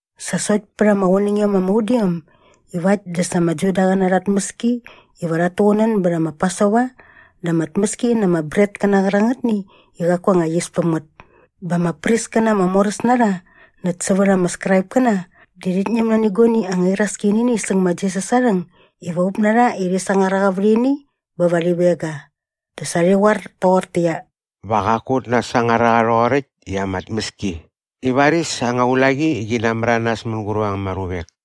Sa sokt pät ama qunängiom ama udiom iva äkt dä sa ama Judaqäna arha tmäski iva rhat tuqunän bät ma Pasova dä ama tmäski na ama bretkäna qärangätni i qaku anga yis päm ngät bä ama priskäna ama moräs na rha näkt sävät ama Skraipkäna di rhit ñäm nani guani anga iraski nä ini säng ma Jisas aa rhäng iva up na rha i rhi sangar a qa vät ini bä va rhi veng ga. Dä sa rhi qoar toqortäqyia, “Va qaku ut nasangar a qa rhoqoräkt i ama tmäski i varis anga ulaqi qi namäranas mänguräp ama ruvek.”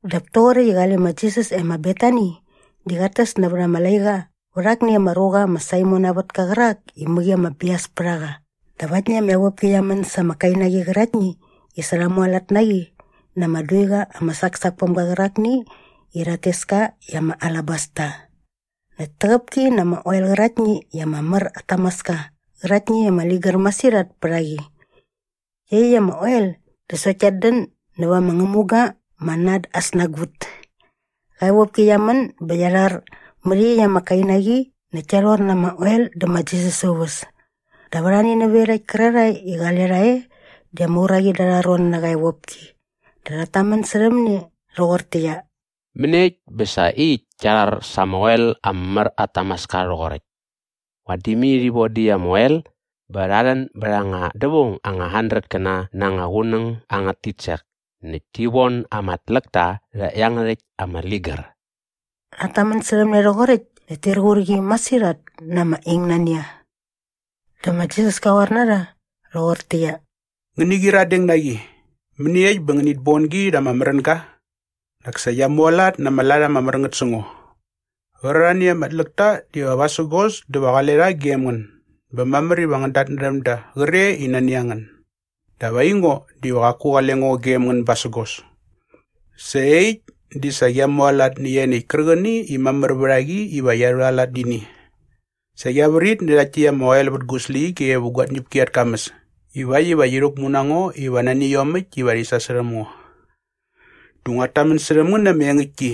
Dap toqoräkt i qale ma Jisas e ma Betani di qat täs nävät ama laiqa va akni ama ruqa ma Saimon aa vätka qärak i mäqi ama bias pät a qa dap aktni ama evopki qia män sa ama kainaqi qäraktni i sa rha mualat na qi na ama duiqa ama saksak päm ga qärakni i rhat tes ka i ama alabasta. Näkt täqäp ki na ama oel qäraktni i ama mär at tamaska qäraktni i ama ligär masirhat pät a qi. Iaqyäkt ama oel di sokt kiat dän näva ama ngämuga ma Nard aa snagut. Qa evopki qia män bä qia rhar mät iaqyäkt ama kainaqi näkt kia rhor na ama oel dä ma Jisas aa uväs. Dap arhani nävät iarhakt kärarhae i qale rha e di ama uraqi da arha ron nä qa evopki dä rhat tamän särhäm ne rhoqortäqyia, “Mäniekt bä sa iaqyäkt kia rhar sa ama oel ama mär at tamaska rhoqoräkt? Vadi mai rhi vodä iaqyäkt ama oel bä rha rhän bät anga dävaung anga handretkäna na anga qunäng angät titsek näkt ti von ama tläkta rhä iangärhäkt ama ligär.” Rhat tamän särhäm ne rhoqoräkt näkt tir qur qi masirhat na ama ingnania. Dä ma Jisas ka qoar na rha rhoqortäqyia, “Ngäni qyiradeng na qi. Mäniekt bä ngänit bon gi rha ama märänga? Nak sa qia mualat na ama lat ama mär ngät sä ngo. Qärarhani ama tläk ta diva vasägos dä va qale rha gem ngän bä mamär iva ngän datnärhäm da qre i nani a ngän. Dap aingo diva qaku qale ngo gem ngän basägos. Sa iaqyäkt di sa qia mualat nä ianiäkt kärqäni i mamär vät a qi iva qia rhualat nä ini. Sa qia vrit nä rhakt täkt ama oel vät gu släqyige vä gua tñäpki at kamäs ivakt iva qi rhäkmu na ngo iva nani iomäkt iva rhi sasärhäm ngo. Dä nguat tamän särhäm ngän na ama engäktki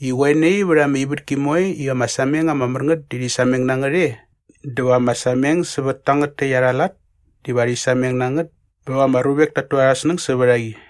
i qoe nai vät ama ivätki moe i ama sameng ama mär ngät di rhi sameng na ngät e dä va ama sameng sävät tangät täkt arha lat diva rhi sameng na ngät bä va ama ruvek ta tu arhä snäng sävät a qi.”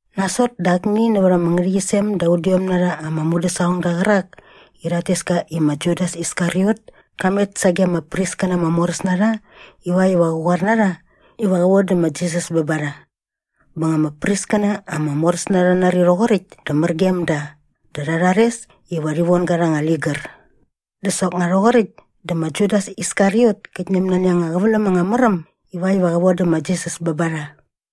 Nasot dä akni nävät ama ngärhäqyisem da udiom na rha ama mudäsaqongda qärak i rhat tes ka i ma Judas Iskariot ka met sage ama priskäna ama moräs na rha ivakt iva qä qoar na rha iva qä vodä ma Jisas bä ba rha. Bä nga ama priskäna ama moräs na rha rha nari rhoqoräkt dä mär gem da dä rha rhares iva rhi von ga rha anga ligär. Dä soknga rhoqoräkt dä ma Judas Iskariot kät ñäm nani anga qäväläm anga mär äm ivakt iva qä vodä ma Jisas bä ba rha.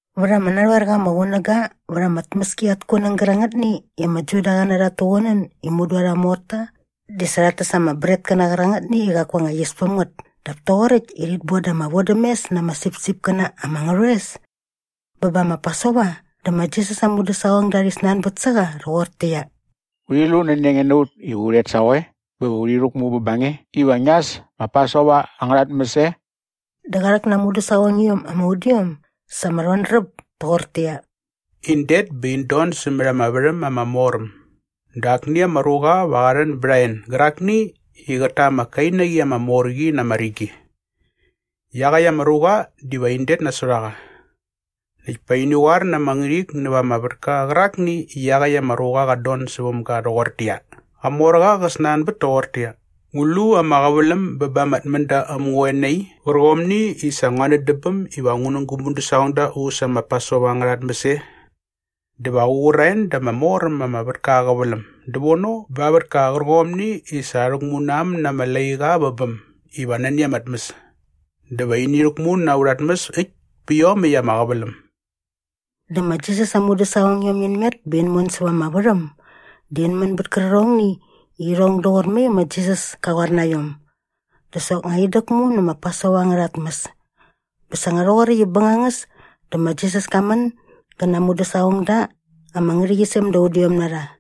Vät ama narhoer qa ama qunäga vät ama tmäski at kunäng gärangätni i ama Judaqäna rhat tuqunän i mudu arha morta di sa rhat täs ama bretkäna qärangätni i qaku anga yis päm ngät dap toqoräkt i rhit boda ama vodämes na ama sipsipkäna ama ngärhoes bä bä ma Pasova dä ma Jisas aa mudäsaqongda rhi snanbät sä qa rhoqortäqyia, “Urhi lu nani a nge na ut iva u rhet sa qoe bä va urhi rhäkmu bä ba nge iva ngia äs ma Pasova angärha tmäs e?” Dä qa rhäk na aa mudäsaqongiom ama udiom sa ama rhodräp toqortäqyia, “In det bä in don sämät ama värhäm ama mor äm dä akni ama ruqa va qa rhän bät a en gärakni i qät ta ama kainaqi ama mor qi na ama rigi. Iaqäkt ama ruqa diva in det nasot a qa. Näkt pa ini qoar na ama ngärhik näva ama vätka qärakni i iaqäkt ama ruqa qat don säväm ga rhoqortäqyia, ‘Qamorqa qä snanbät toqortäqyia, ngu lu ama qäväläm bä ba ama tmända äm ngä qoe nai qärqomni i sa ngua nän dä bäm iva ngu nä gu mudäsaqongda u äs ma Pasova angärha tmäs e?’ Dä va qä qur a en da ama mor äm ama vätka aa qäväläm dävono ba aa vätka qärqomni i sa rha rhäkmu na äm na ama laiqa vä bäm iva nani ama tmäs. Dä va ini rhäkmu na aurha tmäs äkt pä iomäkt ama qäväläm.” Dä ma Jisas aa mudäsaqongiom in met bä in mon säva ama värhäm dä in män bät kärqärhongni i irhong doqor mai ma Jisas ka qoar na iom. Dä soknga in däkmu nä ma Pasova angärha tmäs. Bä sa nga rhoqoräkt i bängangäs dä ma Jisas ka män gä na aa mudäsaqongda ama ngärhäqyisem da udiom na rha.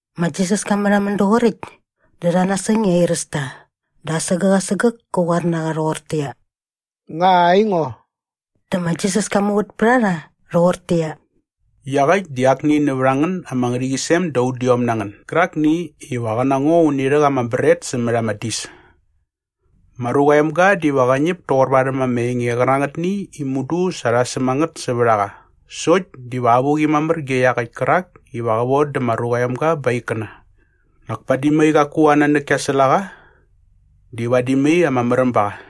Ma Jisas ka märhamän doqoräkt dä rha nasäng i airäs ta dä asägäk asägäk kä qoar na qa rhoqortäqyia, “Nga aingo?” Dä ma Jisas ka muvät pät a rha rhoqortäqyia, “Iaqäkt di akni nävät a ngän ama ngärhäqyisem da udiom na ngän gärakni iva qä na ngo uni rhäk ama bret sämät ama dis. Ma Ruqa aa Emga diva qä ñäp toqor varhäm ama enge qärangätni i mudu sa rha säm a ngät sävät a qa sokt diva avuqi mamär ge iaqäkt kärak iva qä vodä ma Ruqa aa Emga ba aa ikkäna. Nak padi mai qaku aa nanäk ki nasäl a qa di vadi mai ama märäm ba qa.”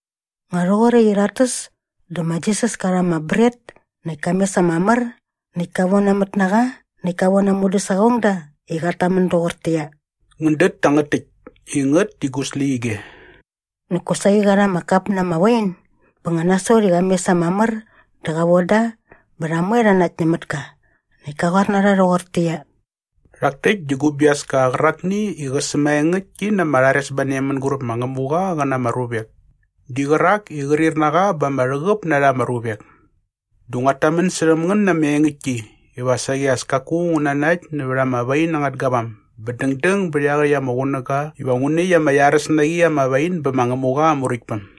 Nga rhoqoräkt i rhat täs dä sa ma Jisas ka rha ama bret näkt ka mes ama mär näkt ka vonamät na qa näkt ka von aa mudäsaqongda i qat tamän doqortäqyia, “Ngän dät tangät täkt i ngät di gu släqyige.” Näkt kosaqi qa rha ama kap na ama wain bä nga nasot i qa mes ama mär dä qa von da bä rha moe rha nakt nämät ka. Näkt ka qoar na rha rhoqortäqyia, “Rhak täkt di gu biaska qärakni i qä sämaengäktki na ama rharesbane mänguräp ma Ngämuqa qä na ama ruvek di qärak i qrir na qa ba ama rhäqäp na rha ama ruvek. Dä nguat tamän särhäm ngän na ama engäktki iva saqi as kaku ngu nanakt nävät ama wain angät gavam bä dängdäng bät iaqäkt ama qunäga iva ngu näkt ama iaräs na qi ama wain bä ma Ngämuqa aa Muräktpäm.”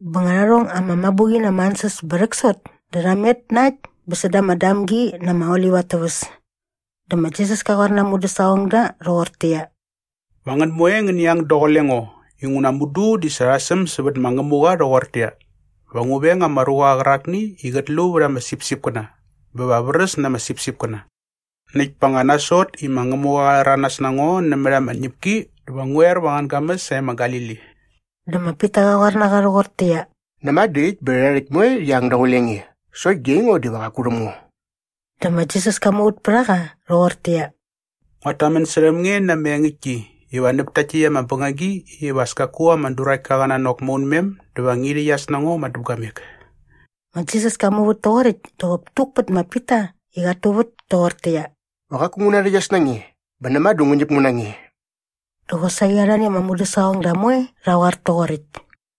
Bä nga rha rhong ama mabuqi na ama ansäs bä rhäksot dä rha met na äkt bä säda ama Damgi na ama Olip at täväs. Dä ma Jisas ka qoar na aa mudäsaqongda rhoqortäqyia, “Va ngän moe ngäni ang daqule ngo inguna mudu di sa rha säm sävät ma Ngämuqa rhoqortäqyia, “‘Va ngu veng ama ruqa qärakni i qät lu vät ama sipsipkäna bä va vräs na ama sipsipkäna.’ Näkt pa nga nasot i ma Ngämuqa qa rhäranas na ngo nämät ama tñäpki dä va ngu er va angän gamäs sae ma Galili.” Dä ma Pita qa qoar nä qa rhoqortäqyia, “Näma dä äkt bä rhärha rhäkt moe rhi ang daqule nge sokt di aingo diva qaku rhäm ngo.” Dä ma Jisas ka muvät pät a qa rhoqortäqyia, “Nguat tamän särhäm nge na ama engäktki iva näp takt täkt ama bängagi iva as kaku ama duraktka qä nanok maunmem dä va ngi rhäqyas na ngo madäpguamek.” Ma Jisas ka muvät toqoräkt dä qop tuk pät ma Pita i qat tuvät toqortäqyia, “Va qaku ngu narhäqyas na nge bä näma dä ngu ñäp ngu na nge.” Dä qosaqi arhani ama mudäsaqongda moe rha qoar toqoräkt.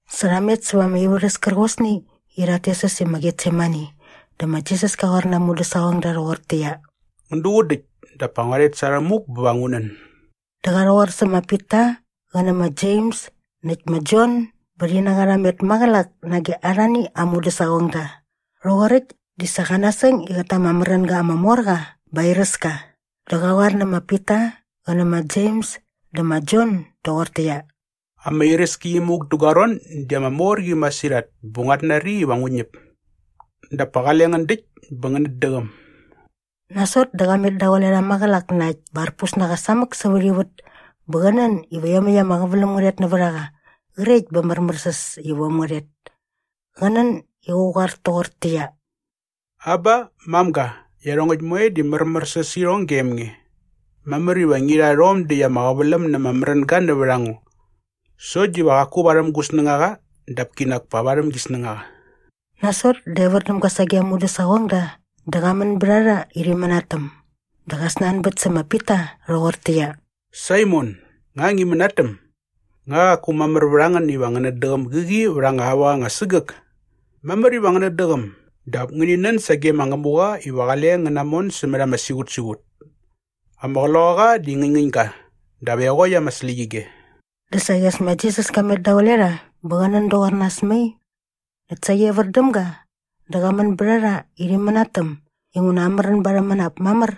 Sa rha met säva ama ivärhäs kärqosni i rhat tes äs i ma Getsemani dä ma Jisas ka qoar na aa mudäsaqongda rhoqortäqyia, “Ngän duqun däkt dap pa ngua rhet sa rhämuk bä va ngu nän.” Dä qa rhäqoar sä ma Pita qä nä ma Jems näkt ma Jon bä rhi na qa rha met maqälak nage arhani aa mudäsaqongda. Rhoqoräkt di sa qa nasäng i qät ta ama märänga ama mor qa bä airäs ka. Dä qa qoar nä ma Pita qä nä ma Jems dä ma Jon doqortäqyia, “Ama iräski imuk dä gua ron di ama mor qi masirhat bä nguat nari iva ngu ñäp. Dap pa qale ngän däkt bä ngänät däqäm.” Nasot dä qa met daqule rha maqälak na äkt bä arpus na qa samäk sävät ivät bä qä nän iva iomäkt ama qäväläm ngä rhet nävät a qa qrekt bä märmärsäs iva äm ngä rhet. Qa nän i qä qoar toqortäqyia, “Aba, mamga, iarhongäkt moe di märmärsäs sä irhong gem nge. Mamär iva ngi rha rhom däkt ama qäväläm na ama märänga nävät a ngo. Sokt diva qoki qaku varhäm gu snängaqa dap kinak pa varhäm gi snängaqa.” Nasot dä evär däm ga sage aa mudäsaqongda dä qa män bät a rha i rhi mänatäm. Dä qa snanbät sä ma Pita rhoqortäqyia, “Saimon, nga ngi mänatäm? Nga qaku mamär vät a ngän iva ngänät däqäm gäqi vät anga aua anga sägäk? Mamär iva ngänät däqäm dap ngäni nän sage ma Ngämuqa iva qale ngän namon sämät ama siqutsiqut. Ama qloqaqa di ngäñngäñ ga dap eqokt ama släqyige.” Dä saqi as ma Jisas ka met daqule rha bä qä nän doqor nas mai. Näkt saqi evär däm ga dä qa män bät a rha i rhi mänatäm inguna amärän ba arhä mänap mamär.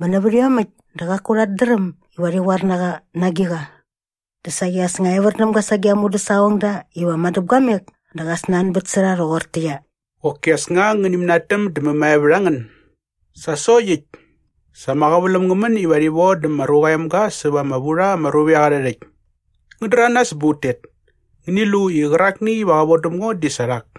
Bä nävät iomäkt dä qaku rhat dräm iva rhi qoar na qa na agiqa. Dä saqi as nga evär däm ga sage ama mudäsaqongda iva madäpguamek dä qa snanbät sä rha rhoqortäqyia, “Qoki as nga ngäni mänatäm dä mämae vät a ngän? Sa sokt äkt! Sa ama qäväläm ngä män iva rhi vodä ma Ruqa aa Emga säva ama vu rha ama ruvek arhä rhäkt. Ngän däranas bä ut tet. Ngäni lu i qärakni iva qä vodäm ngo di sa rhak.”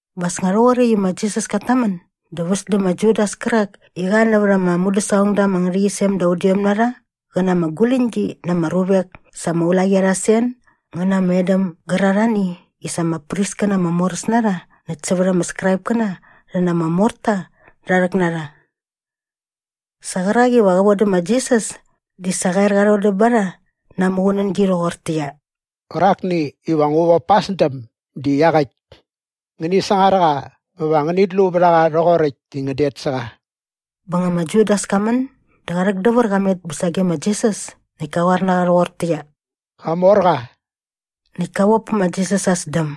Bä as nga rhoqoräkt i ma Jisas kat tamän dä väs dä ma Judas kärak i qa nävät ama mudäsaqongda ama ngärhäqyisem da udiom na rha qä na ama guläñgi na ama ruvek sa ama ulaqi arha sen ngä na ama edäm gärarhani i sa ama priskäna ama moräs na rha näkt sävät ama Skraipkäna rhi na ama morta rha rhäk na rha. Sa qärak iva qä vodä ma Jisas di sa qa er qa rhodäm ba rha na aa muqunängi rhoqortäqyia, “Qärakni iva ngu vop pa aa sdäm di iaqäkt. Ngäni sangar a qa bä va ngänit lu vät a qa rhoqoräkt i ngän det sä qa.” Bä nga ma Judas ka män dä qa rhäkdävär qa met bä sage ma Jisas näkt ka qoar na qa rhoqortäqyia, “Qamorqa!” Näkt ka vop pä ma Jisas aa sdäm.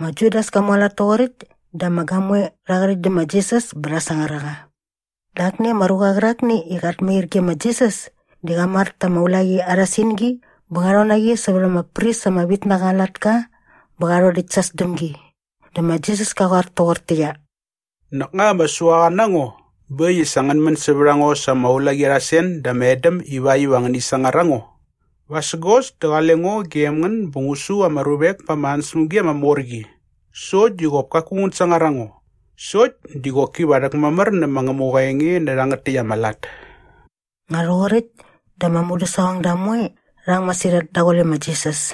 Ma Judas ka mualat toqoräkt dä ama gamoe rha qärhäkt dä ma Jisas bä rha sangar a qa. Dä akni ama ruqa qärakni i qat mair ge ma Jisas di qa mar ta aa ulaqi arha singi bä qa rhon na qi sävät ama pris ama vit na qa aa latka bä qa rhodäkt sa aa sdämgi. Dä ma Jisas ka qoar toqortäqyia, “Nak nga ama suaqa na ngo bä äkt i sa ngän män sävät a ngo sa ama ulaqi arha sen dä ama edäm ivakt iva ngäni sangar a ngo? Vasägos dä qale ngo gem ngän bä ngu su ama ruvek pa ama ansäspämgi ama mor qi sokt di qop kaku ngän sangar a ngo. Sokt di qoki va rhäkmamär nä ma Ngämuqa aa enge nä rhangät täkt ama lat.” Nga rhoqoräkt dä ama mudäsaqongda moe rha ang masirhat daqule ma Jisas.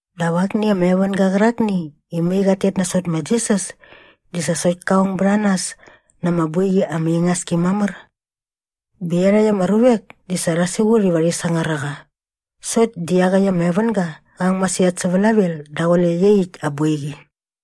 Dap akni ama evänga qärakni i mai qat tet nasot ma Jisas di sa sokt ka ong bät a nas na ama boiqi ama ingas ki mamär. Bä iarhakt ama ruvek di sa rha siqut iva rhi sangar a qa sokt di iaqäkt ama evänga qa ang masirhat sä vlavel daqule iaqyäkt aa boiqi.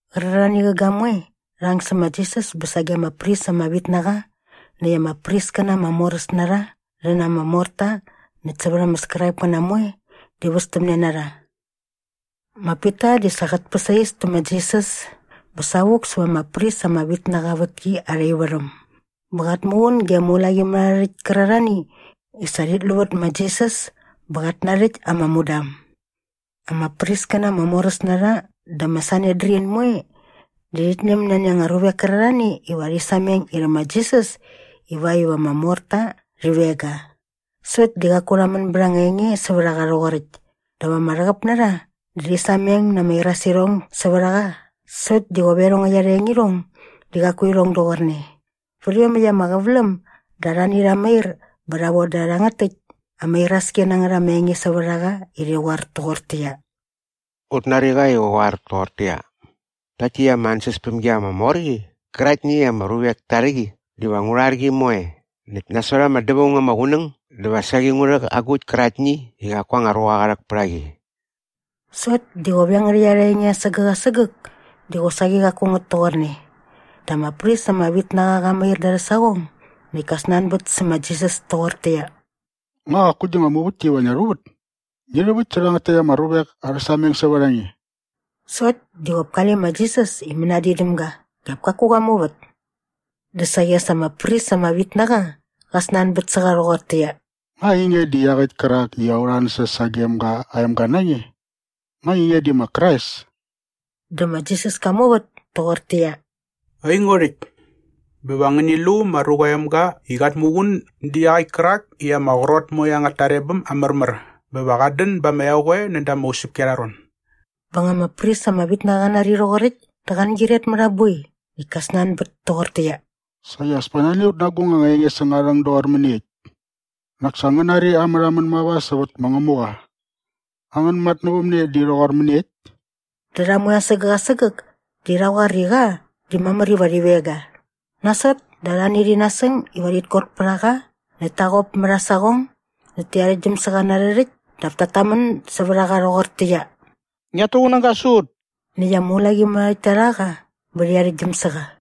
Qärarhani qä gamoe rha ang sä ma Jisas bä sage ama pris ama vit na qa näkt ama priskäna ama moräs na rha rhi na ama morta näkt sävät ama Skraipkäna moe di västämne na rha. Ma Pita di sa qät päsais tä ma Jisas bä savuk säva ama pris ama vit na qa aa vätki arha ivärhäm bä qat muqun ge ama ulaqimärharhärhäkt kärarhani i sa rhit lu vät ma Jisas bä qat narhäkt ama mudam. Ama priskäna ama moräs na rha dä ma Sanedrin moe di rhit ñäm nani anga ruvek kärarhani iva rhi sameng irhä ma Jisas ivakt iva ama morta rhi veng ga. Sokt di qaku rha män bät anga enge sävät a qa rhoqoräkt. Dä ama rhäqäp na rha di rhi sameng na ama irasirhong sävät a qa sokt di qop iarhongäkt arha engirhong di qaku irhong doqorne. Vät iomäkt ama qäväläm dä arhani rha mair bä rha voda rhangät täkt ama iraski na ngät ama enge sävät a qa i rhi qoar toqortäqyia, “Ut nari qa i qä qoar toqortäqyia, ‘Rhakt täkt ama ansäspämgi ama mor qi qäraktni i ama ruvek ta rhä qi diva ngu rhar qi moe näkt nasot ama dävaung ama qunäng dä va saqi ngu rhäk agukt käraktni i qaku anga ruqa qa rhäk pät a qi.’” Sokt di qop iangärhäkt arha enge asägäk asägäk di qosaqi qaku ngät toqorne. Dä ama pris ama vit na qa qa mair da arhä saqong näkt ka snanbät sä ma Jisas toqortäqyia, “Nga qaku gi nga muvätki iva ngia rhuvät? Ngi rhäväkt sä rhangät täkt ama ruvek arhä sameng sävät a nge.” Sokt di qop kale ma Jisas i mänadin däm ga dap kaku qa muvät. Dä saqi as ama pris ama vit na qa qa snanbät sä qa rhoqortäqyia, “Nga ainge di iaqäkt kärak i aurha ansäs sagem ga aa emga na nge? Nga ainge di ma Krais?” Dä ma Jisas ka muvät toqortäqyia, “Aingo rhäkt. Bä va ngäni lu ma Ruqa aa Emga i qat muqun dä iaqäkt kärak i ama qrot moe angät tarebäm aa märmär bä va qat dän ba ama eqoe näda ama usäpki arha ron.” Bä nga ama pris ama vit na qa qa nari rhoqoräkt dä qa angyiret mät aa boi näkt ka snanbät toqortäqyia, “Saqi as pa nani a ut na agung anga enge säng aa rhäng doqor mäniekt? Nak sa ngän nari aa märhamän mava sävät ma Ngämuqa. Angän matnävämne di rhoqor mäniekt?” Dä rha moe asägäk asägäk di rha qoar i qa di mamär iva rhi veng ga. Nasot dä arhani rhi nasäng iva rhit kot pät a qa näkt ta qop mät aa saqong näkt ti arhäktgyäm sä qa na arhä rhäkt dap tat tamän sävät a qa rhoqortäqyia, “Ngiat tuqunäga sä ut!” Näkt ama ulaqimärharhärhäkt ta rha qa bä rhi arhäktgyäm sä qa.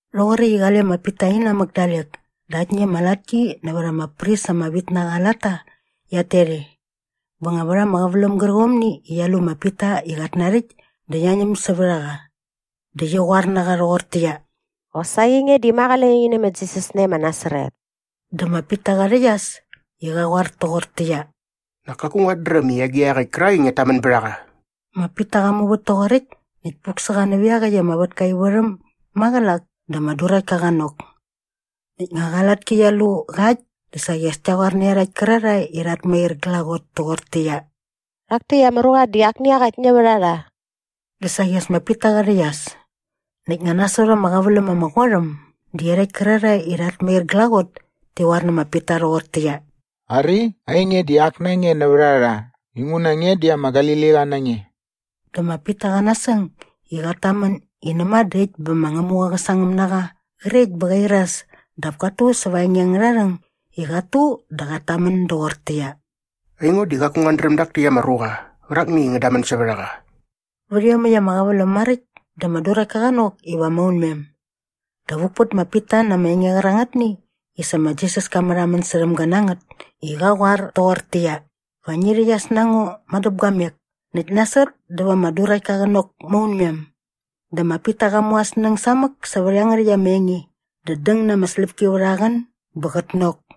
Rhoqoräkt i qale ma Pita inamäk dalek dä aktni ama latki nävät ama pris ama vit na qa aa latta qiat tet e. Bä nga vät ama qäväläm gärqomni i qia lu ma Pita i qat narhäkt dä qia ñäm sävät a qa. Dä qi qoar na qa rhoqortäqyia, “Qosaqi nge di ma qale nge ngi nä ma Jisas nae ma Nasaret.” Dä ma Pita qa rhäqyas i qa qoar toqortäqyia, “Nak kaku nguat dräm i agiqa iaqäkt kärakni i ngiat tamän bät a qa.” Ma Pita qa muvät toqoräkt näkt puk sä qa nävät iaqäkt ama vätka aa ivärhäm maqälak dä ama duraktka qa nok. Näkt nga qa latki qia lu qa äkt dä saqi as kia qoar nä iarhakt kärarhae i rhat mair glaqot toqortäqyia, “Rhak täkt ama ruqa di akni iaqäkt nävät a rha.” Dä saqi as ma Pita qa rhäqyas. Näkt nga nasot ama qäväläm ama qot äm dä iarhakt kärarhae i rhat mair glaqot ti qoar nä ma Pita rhoqortäqyia, “Ari, ainge di ak na nge nävät a rha inguna nge di ama Galiliqa na nge.” Dä ma Pita qa nasäng i qat tamän i näma dä äkt bä ma Ngämuqa qä sangäm na qa qrekt bä qa iras dap kat tu sävät aa enge angärha rhäng i qat tu dä qat tamän doqortäqyia, “Aingo di qaku nguat dräm dak täkt ama ruqa qärakni i ngän damän sävät a qa.” Vät iomäkt ama qäväläm maräkt dä ama duraktka qa nok iva maunmem. Dä vuk pät ma Pita na ama enge qärangätni i sa ma Jisas ka märhamän särhäm ga na ngät i qa qoar toqortäqyia, “Va ngi rhäqyas na ngo madäpguamek näkt nasot dä va ama duraktka qä nok maunmem.” Dä ma Pita qa mu aa snäng samäk sävät iangärhäkt ama enge dä däng na ama släpki vät aa qän bä qät nok.